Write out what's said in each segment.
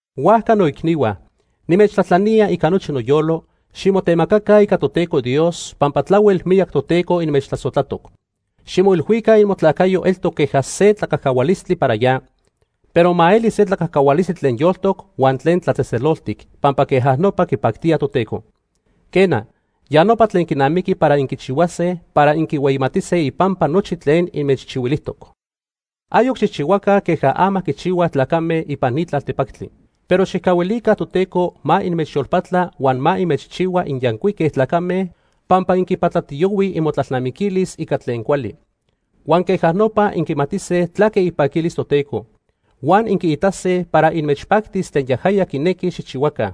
Huajca noicnihua, nimechtlajtlanía ica nochi noyolo, ximotemacaca ica Toteco Dios pampa tlahuel miyac Toteco inmechtlasojtlatoc. Ximoilhuica imotlacayo eltoc queja se tlacajcahualistli para ya, pero ma eli se tlacajcahualistli tlen yoltoc huan tlen tlatzejtzeloltic, pampa queja nopa quipactía Toteco. Quena, ya nopa tlen quinamiqui para inquichihuase para inquihueyimatise ipampa nochi tlen inmechchihuilijtoc. Ayoc xijchihuaca queja ama quichihuaj tlacame ipan ni tlaltepactli. Pero xijcahuilica Toteco ma inmechyolpatla huan ma inmechchihua inyancuique tlacame pampa inquipatlatiyohuij imotlalnamiquilis ica tlen cuali. Huan queja nopa inquimatise tlaque ipaquilis Toteco. Huan inquiitase para inmechpactis tlen yajaya quinequi xijchihuaca,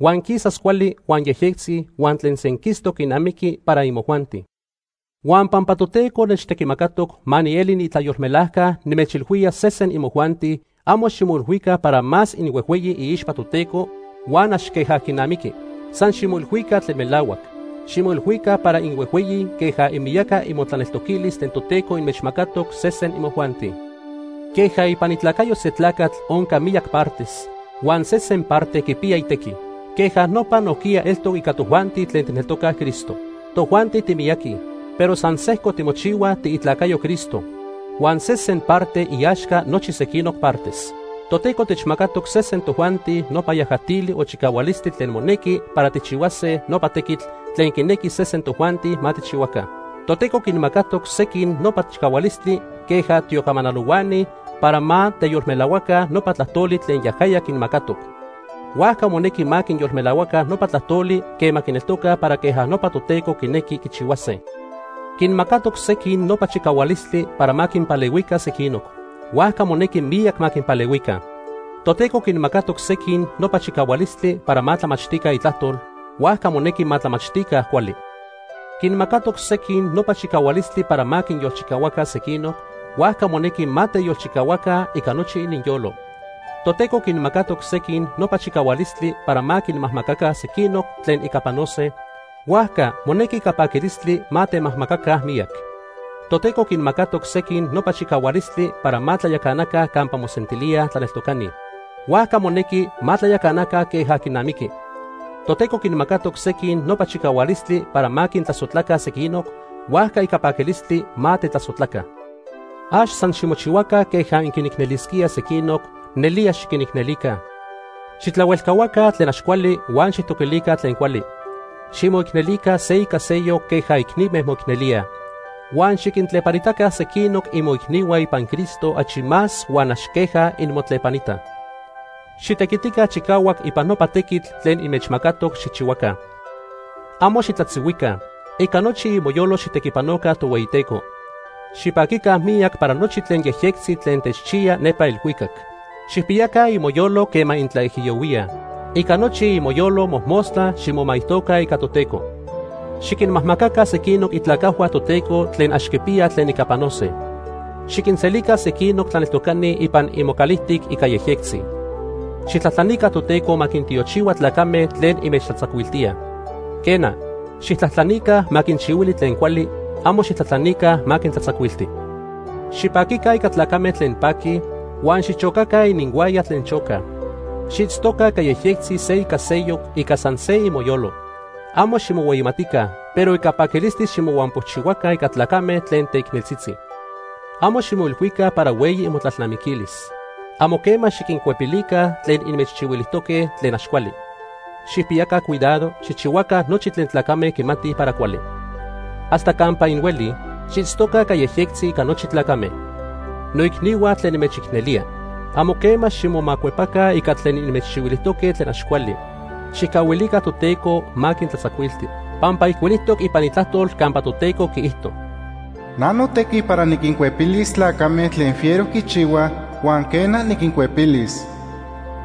huan quisas cuali huan yejyectzi huan tlen senquistoc quinamiqui para imojuanti. Huan pampa Toteco nechtequimacatoc ma nieli niitlayolmelajca nimechilhuía sesen imojuanti, amo ximoilhuica para más inhuejhueyi iixpa Toteco huan ax queja quinamiqui. San ximoilhuica tlen melahuac. Ximoilhuica para inhuejhueyi queja imiyaca imotlaneltoquilis tlen Toteco inmechmacatoc sesen imojuanti. Queja ipan itlacayo se tlacatl onca miyac partes, huan sesen parte quipiya itequi, queja nopa nojquiya eltoc ica tojuanti tlen tijneltocaj Cristo. Tojuanti timiyaqui, pero san sejco timochihuaj tiitlacayoj Cristo. Huan sesen parte iaxca nochi sequinoc partes. Toteco techmacatoc sesen tojuanti nopa yajatili o chicahualistli tlen monequi para tijchihuase nopa tequitl tlen quinequi sesen tojuanti ma tijchihuaca. Toteco quinmacatoc sequin nopa chicahualistli queja tiocamanalohuani para ma teyolmelahuaca nopa tlajtoli tlen yajaya quinmacatoc. Huajca monequi ma quiyolmelahuaca nopa tlajtoli quema quineltocaj para queja nopa Toteco quinequi quichihuase. Quinmacatoc sequin nopa chicahualistli para ma quinpalehuica sequinoc, huajca monequi miyac ma quinpalehuica. Toteco quinmacatoc sequin nopa chicahualistli para ma tlamachtica Itlajtol, huajca monequi ma tlamachtica cuali. Quinmacatoc sequin nopa chicahualistli para ma quinyolchicahuaca sequinoc, huajca monequi ma teyolchicahuaca ica nochi ininyolo. Toteco quinmacatoc sequin nopa chicahualistli para ma quinmajmacaca sequinoc tlen ica panose, huajca monequi ica paquilistli ma temajmacaca miyac. Toteco quinmacatoc sequin nopa chicahualistli para ma tlayacanaca campa mosentilíaj tlaneltocani, huajca monequi ma tlayacanaca queja quinamiqui. Toteco quinmacatoc sequin nopa chicahualistli para ma quintlasojtlaca sequinoc, huajca ica paquilistli ma tetlasojtlaca. Ax san ximochihuaca queja inquinicnelisquíaj sequinoc, nelía xiquinicnelica. Xijtlahuelcahuaca tlen ax cuali huan xijtoquilica tlen cuali. Ximoicnelica se ica seyoc queja icnime moicnelíaj. Huan xiquintlepanitaca sequinoc imoicnihua ipan Cristo achi más huan ax queja inmotlepanitaj. Xitequitica chicahuac ipan nopa tequitl tlen inmechmacatoc xijchihuaca. Amo xitlatzihuica. Ica nochi imoyolo xijtequipanoca Tohueyiteco. Xipaquica miyac para nochi tlen yejyectzi tlen techchiya nepa elhuicac. Xijpiyaca imoyolo quema intlaijiyohuíaj. Ica nochi imoyolo mojmostla ximomaijtoca ica Toteco. Xiquinmajmaca sequinoc itlacajhua Toteco tlen ax quipiyaj tlen ica panose. Xiquinselica sequinoc tlaneltocani ipan imocalijtic ica yejyectzi. Xijtlajtlanica Toteco ma quintiochihua tlacame tlen inmechtlatzacuiltíaj. Quena, xijtlajtlanica ma quinchihuili tlen cuali, amo xijtlajtlanica ma quintlatzacuilti. Xipaquica ica tlacame tlen paquij, huan xichocaca ininhuaya tlen chocaj. Xiitztoca ica yejyectzi se ica seyoc ica san se imoyolo. Amo ximohueyimatica, pero ica paquilistli ximohuampochihuaca ica tlacame tlen teicneltzitzi. Amo ximoilhuica para hueyi imotlalnamiquilis. Amo quema xiquincuepilica tlen inmechchihuilijtoque tlen ax cuali. Xijpiyaca cuidado xijchihuaca nochi tlen tlacame quimatij para cuali. Hasta campa inhuelij, xiitztoca ica yejyectzi ica nochi tlacame. Noicnihua tlen nimechicnelía. Amo quema ximomacuepaca ica tlen inmechchihuilijtoque tlen ax cuali. Xijcahuilica Toteco ma quintlatzacuilti. Pampa ijcuilijtoc ipan Itlajtol campa Toteco quiijto: “Na notequi para niquincuepilis tlacame tlen fiero quichihuaj, huan quena, niquincuepilis.”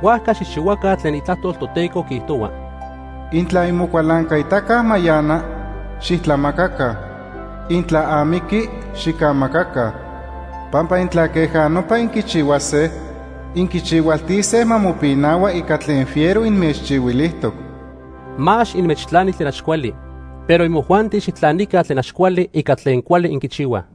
Huajca xijchihuaca tlen Itlajtol Toteco quiijtohua: “Intla imocualancaitaca mayana, xijtlamacaca. Intla amiqui, xicamacaca. Pampa intla queja nopa inquichihuase, inquichihualtise ma mopinahua ica tlen fiero inmechchihuilijtoc.” Ma ax inmechtlani tlen ax cuali. Pero imojuanti xijtlanica tlen ax cuali ica tlen cuali inquichihuaj.